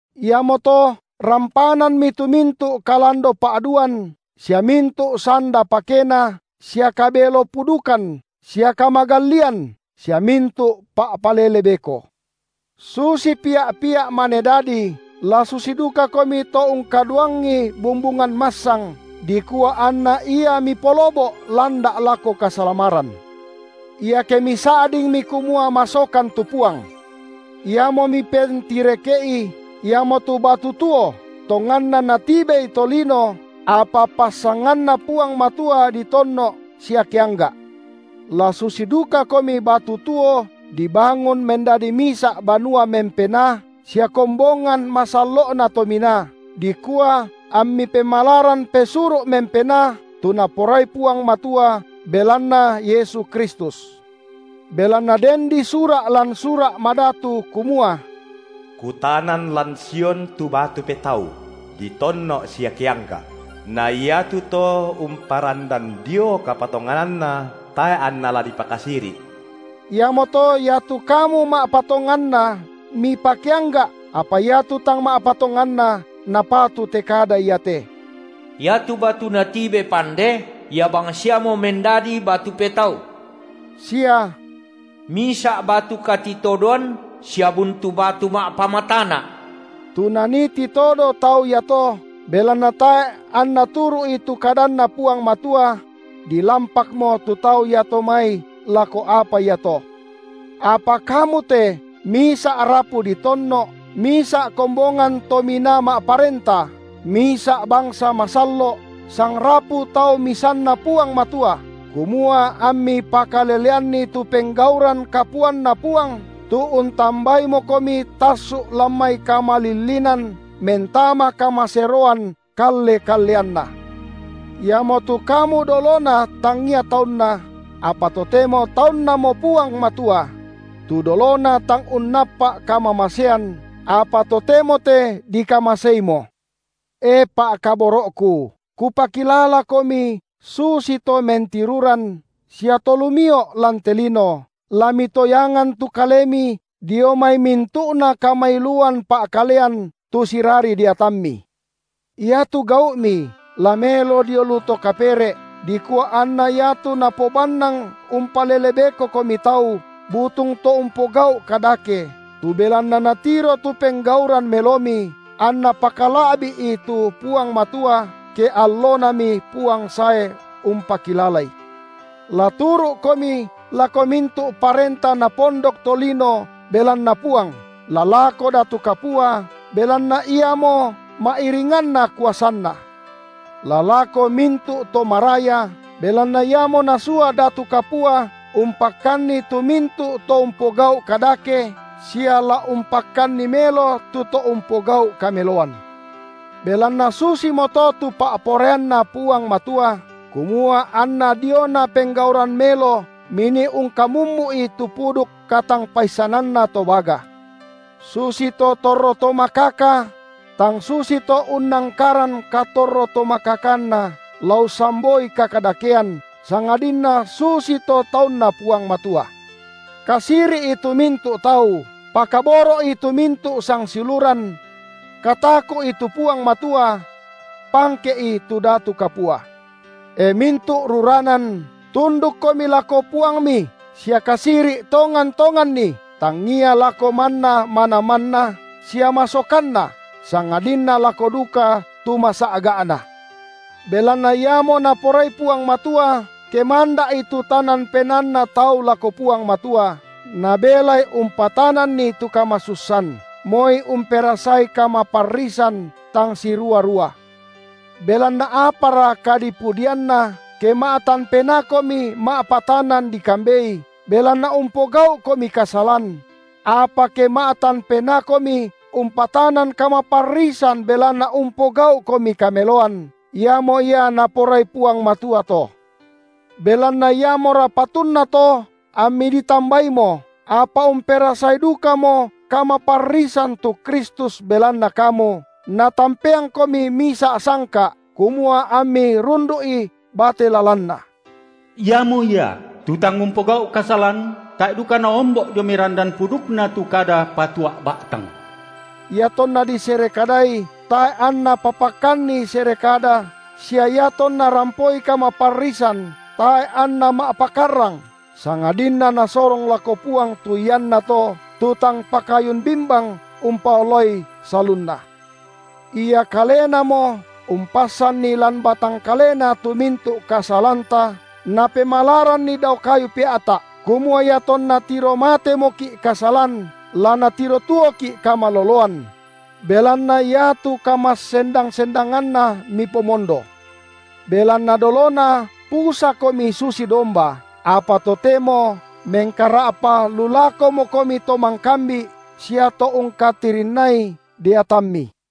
Iamoto rampananmi tu mintu’ kalando-pa’duan sia mintu’ sanda pakena sia kabelo-pudukan sia kamagallian sia mintu’ pa’palele beko; susi pia’-pia’ mane dadi, la susi dukakomi to ungkaduangi bumbungan massang, dikua anna ia mipolobo’ landa’ lako kasalamaran, iake misa’dingmi kumua masokan tu Puang. Iamo mipentireke’i, iamotu batu tuo, tonganna natibei tolino, apa passanganNa Puang Matua ditonno’ sia keangga’; la susi dukakomi batu tuo dibangun mendadi misa’ banua mempenaa sia kombongan masallo’na tominaa, dikua ammi pemalaran pesuru’ mempenaa, tu Naporai Puang Matua belanna Yesu Kristus. Belanna den disura’ lan Sura’ Madatu kumua: Kutanan lan Sion tu batu petau, ditonno’ sia keangga’; na iatu to umparandan Dio kapatongananna, tae’ anna la dipakasiri’. Iamoto iatu kamu ma’patonganna mipakeangga’, apa iatu tang ma’patonganna napatu te kada iate: iatu batu natibe pande, ia bangsiamo mendadi batu petau, sia: Misa’ batu katitodoan sia buntu batu ma’pamatana’, tu nanii titodo tau iato, belanna tae’ anna turu’i tu kadanNa Puang Matua; dilampakmo tu tau iato mai lako apa iato. Apa kamu te misa’ rapu ditonno’, misa’ kombongan tominaa ma’parenta, misa’ bangsa masallo’, sangrapu tau misanNa Puang Matua, kumua ammi pakaleleanni tu penggauran kapuanNa Puang, tu untambaimokomi tassu’ lan mai kamalillinan mentama kamaseroan kalle-kalleanNa; iamotu kamu dolona tangia taunNa, apa totemo taunNamo Puang Matua; tu dolona tang unnappa’ kamamasean, apa totemo te dikamaseimo. E pa’kaboro’ku, kupakilalakomi susito mentiruran sia to lumio’ lan te lino, la mitoyangan tu kalemi dio mai mintu’na kamailuan pa’kalean tu sirari deatammi; iatu gau’mi la melo dio lu to kapere’, dikua anna iatu napobannang umpalele bekokomi tau butung to umpogau’ kadake, tu belanna natiro tu penggauran melomi, anna pakala’bi’i tu Puang Matua ke alloNami Puang sae umpakilalai. La turu’komi lako mintu’ parenta napondok tolino belanna Puang, la lako datu kapua, belanna iamo ma’iringanna kuasanna; la lako mintu’ to maraya, belanna iamo nasua datu kapua umpakkanni tu mintu’ to umpogau’ kadake, sia la umpakkanni melo tu to umpogau’ kameloan. Belanna susimoto tu pa’poraianNa Puang Matua, kumua anna diona penggauran melo minii ungkamummu’i tu puduk katangpaissananna to baga. Susito torro to makaka; tang susito unnangkaran katorro-tomakakanna la ussamboi kakadakean, sangadinna susito taunNa Puang Matua. Kasiri’i tu mintu’ tau. Pakaboro’i tu mintu’ sangsiuluran. Kataku’i tu Puang Matua. Pangke’i tu datu kapua. E mintu’ ruranan, tundukkomi lako puangmi sia kasiri’ tongan-tonganni, tangia lako manna manamanna sia masokanna, sangadinna lako duka tu masa’ga’na. Belanna iamo Naporai Puang Matua, ke manda’i tu tanan penaanna tau lako Puang Matua, nabelai umpatananni tu kamasussan, moi umperasai kamaparrisan tang sirua-rua. Belanna apara kadipudianna, ke ma’tan penaakomi ma’patanan dikambei, belanna umpogau’komi kasalan? Apa ke ma’tan penaakomi umpatanan kamaparrisan belanna umpogau’komi kameloan, iamo ia Naporai Puang Matua to. Belanna iamora patunna to ammi ditambaimo, apa umperasai dukamo kamaparrisan tu Kristus belanna kamu, Natampeangkomi misa’ sangka’, kumua ammi rundu’i bate lalanNa. Iamo Ia, tu tang umpogau’ kasalan, tae’ duka naombo’ dio mai randan pudukNa tu kada patua’ ba’tang; iatonna disere kadai, tae’ anNa papakkanni sere kada, sia iatonna rampoi kamaparrisan, tae’ anNa ma’pakarrang, sangadinna Nasorong lako Puang tu iannato, tu tang pakayun bimbang umpaolai salunna. Ia Kalenamo umpassanni lan batang kaleNa tu mintu’ kasalanta Napemalaranni dao kayu pea’ta’, kumua iatonna tiro matemoki’ kasalan, la natiro tuoki’ kamaloloan; belanna iatu kamassendang-sendanganNa mipomondo. Belanna dolona pusakomi susi domba, apa totemo mengkara’pa lu lakomokomi To mangkambi’ sia To ungkatirinnai deatammi.